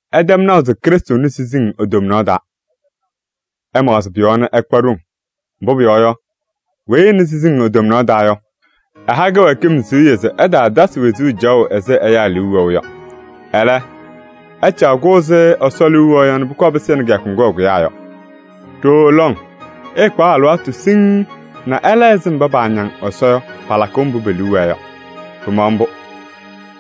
Ɩtɛm naʋ se Krɩstʋ nɩ siziŋ e-tomnaɣ taa. Ɩmaɣzɩ pʋ-yɔɔ nɛ ɩkpa ɖoŋ. Mbʋ pʋyɔɔ yɔ, weyi ɛnɩ siziŋ e-tomnaɣ taa yɔ, ɛha kɩwɛɛkɩm siɣye se ɛtaatasɩ wezuu caɣʋ ɛzɩ ɛyaa liu wɛʋ yɔ. Ɛlɛ, ɛcaɣ-kʋ ɛzɩ Ɛsɔ liu wɛʋ yɔ nɛ pʋkɔɔ pɩsɩnɩ kɩyakʋ ŋgʋ ɛkʋyaa yɔ. Ɖooo lɔŋ ɩɩkpaɣ alɩwaatʋ siŋŋ nɛ ɩla ɛzɩ mba paañaŋ Ɛsɔ yɔ palakʋʋ mbʋ pe-liu wɛɛ yɔ. Pɩmaɣ mbʋ.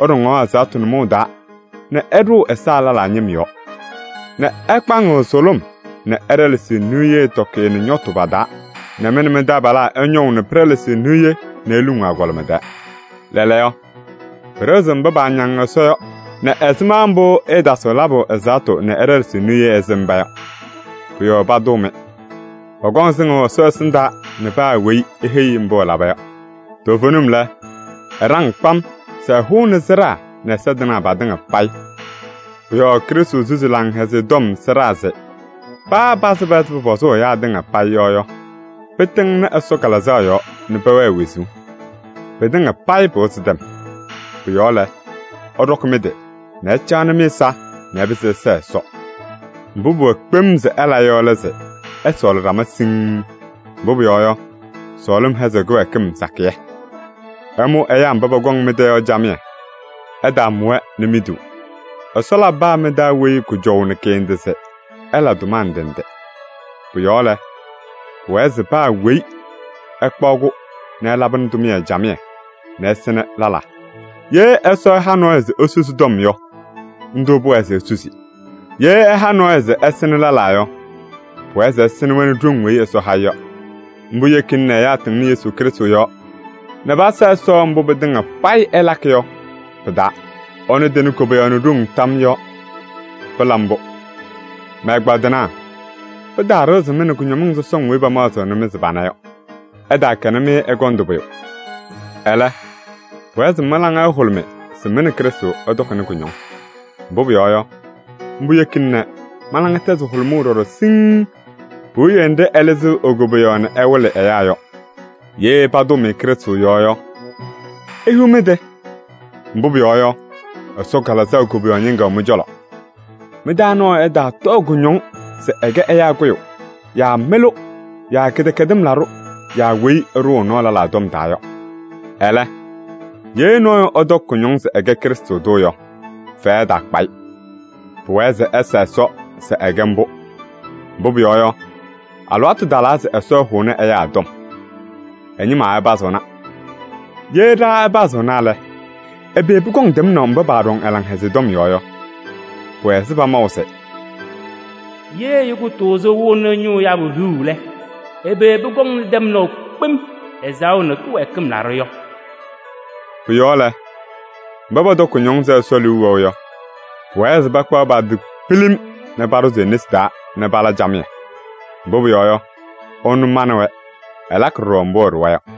Ɩɖɔŋaɣ ɛzaɣtʋ nʋmɔʋ taa nɛ ɩɖʋʋ ɛza lɛlaa ñɩm yɔɔ nɛ ɩkpaŋɩɣ sʋlʋm nɛ ɩɖɛlɛsɩɣ niye tɔkɩyɛ nɛ ñɔtʋ pa-taa nɛ mɩ nɛ mɩ-taabalaa ɩñɔʋ nɛ pɩɖɛlɛsɩɣ niye nɛ iluŋuu agɔlɩma tɛɛ. Lɛɛlɛɛyɔ, pɩɖɩɣzɩɣ mba paañaŋ Ɛsɔ yɔ nɛ ɛzɩma mbʋ ɩɩtaasɩɣ labʋ ɛzaɣtʋ nɛ ɩɖɛlɛsɩɣ niye ɛzɩ mba yɔ. Pʋ-yɔɔ patʋʋ-mɩ. Pɔkɔŋ sɩŋʋʋ Ɛsɔ ɛsɩndaa nɛ paa weyi eheyi-i mbʋ ɛlaba yɔ. Toovenim lɛ, ɛɖaŋ kpam se ɛhʋnɩ sɩɖaa nɛ ɛza tɩnaa patɩŋa payɩ. Pʋ-yɔɔ Krɩstʋ susi Laŋhɛzɩyɛ Tɔm sɩɖaa se paa pasɩba ɛzɩ pʋpɔzʋʋ ɛyaa tɩŋa payɩ yɔ yɔ, pɩtɩŋnɩ Ɛsɔ Kalɩzaɣ yɔɔ nɛ pɛwɛɛ wezuu. Pɩtɩŋa payɩ pɩwɩzɩ tɛm. Pʋ-yɔɔ lɛ, ɩɖɔkɩ mɩ-tɩ nɛ ɩcaɣnɩ mɩ-ɛza nɛ ɩpɩzɩ ɩsɛɛ Ɛsɔ. Mbʋ pʋwɛɛ kpem se ɩla yɔ lɛ se ɩsɔɔlɩ ɖama siŋŋ. Mbʋ pʋyɔɔ yɔ, sɔɔlɩm hɛzɩɣ kɩwɛɛkɩm sakɩyɛ. Ɩmʋ ɛyaa mba pɔkɔŋ mɩ-tɛ yɔ camɩyɛ. Ɩtaamʋ-wɛ nɛ miduu. Ɛsɔ labɩ paa mɩ-taa weyi kʋjɔʋ nɛ kɩ-ndɩ se ɛla tʋma ndɩ ndɩ. Pʋ-yɔɔ lɛ, pʋwɛɛ se paa weyi ɛkpaɣ-kʋ nɛ ɛlabɩnɩ tʋmɩyɛ camɩyɛ nɛ ɛsɩnɩ lɛlaa. Ye Ɛsɔ ɛha nɔɔyʋ se esusi ɛ-tɔm yɔ, ndʋ pʋwɛɛ se esusi. Ye ɛha nɔɔyʋ se ɛsɩnɩ lɛlaa yɔ, pʋwɛɛ se ɛsɩnɩ-wɛ nɛ ɖoŋ weyi Ɛsɔ ha-ɩ yɔ. Mbʋ yekina nɛ ɛyaa tɩŋnɩ Yesu Krɩstʋ yɔɔ nɛ pasa Ɛsɔ mbʋ pɩtɩŋa payɩ ɩlakɩ yɔ pɩ-taa. Ɛnʋ tɩnɩ koboyaɣ nɛ ɖoŋ tam yɔɔ. Pɩla mbʋ! Mɛ-ɛgbaadɩnaa! Pɩtaaɖɩɣzɩ-mɩ nɛ kʋñɔmɩŋ sɔsɔŋ weyi pamaɣzɩɣnɩ-mɩ se pana yɔ. Ɩtaakɛnɩ-mɩ ɛgɔndʋ pʋyʋ. Ɛlɛ, pʋwɛɛ se mɩ-laŋa ɛhʋlʋmɩ se mɩ nɛ Krɩstʋ ɩtɔkɩnɩ kʋñɔŋ. Mbʋ pʋyɔɔ yɔ, mbʋ yekina nɛ mɩ-laŋa tɛzɩ hʋlʋmʋʋ ɖɔɖɔ siŋŋ puwiye nɖɩ ɛlɩzɩɣ e-koboyaɣ nɛ ɛwɩlɩ ɛyaa yɔ. Ye patʋʋ-mɩ Krɩstʋ yɔɔ yɔ, ihiɣ mɩ-tɩ! Mbʋ pʋyɔɔ yɔ, Ɛsɔ Kalɩzaɣ koboyaɣ ñɩŋga wɛ mɩ-cɔlɔ. Mɩ-taa nɔɔyʋ ɛtaatɔɔ kʋñɔŋ se ɛkɛ ɛyaa kʋyʋ yaa mɩlʋ yaa kɩdɛkɛdɩm laɖʋ yaa weyi ɛɖʋʋ ɛ-nɔɔ lɛlaa tɔm taa yɔ. Ɛlɛ, ye nɔɔyʋ ɛtɔkɩ kʋñɔŋ se ɛkɛ Krɩstʋ tʋ yɔ, fɛyɛ ɛtaakpa-ɩ. Pʋwɛɛ se ɛsa Ɛsɔ se ɛkɛ mbʋ. Mbʋ pʋyɔɔ yɔ, alɩwaatʋ talaa se Ɛsɔ ɛhʋnɩ ɛyaa tɔm. Ɛ-ñɩma ɛpazɩɣna. Ye ɖa ɛpazɩɣna lɛ, ɛbɛ pʋkɔŋ tɛmnaʋ mba paaɖɔŋ ɛ-Laŋhɛzɩyɛ tɔm yɔɔ yɔ? Pʋwɛ ɛzɩ pamaʋ se: “Ye ɛyʋ kʋtʋʋzʋ ɛwɩɣnɩ ñʋʋ yabʋ hiɣu lɛ, ɛbɛ pʋkɔŋ tɛmnaʋ kpem ɛzaɣʋ nɛ kɩwɛɛkɩm laɖʋ yɔ?” Pʋ-yɔɔ lɛ, mba pɔtɔkɩ kʋñɔŋ ɛzɩ Ɛsɔ liu wɛʋ yɔ, pʋwɛɛ se pakpaɣ pa-tɩ pilim nɛ paɖʋzɩ e-nesi taa nɛ pala camɩyɛ. Mbʋ pʋyɔɔ yɔ, ɛnʋ manɩ-wɛ, ɛlakɩ ɖɔɖɔ mbʋ ɛɖʋwa yɔ.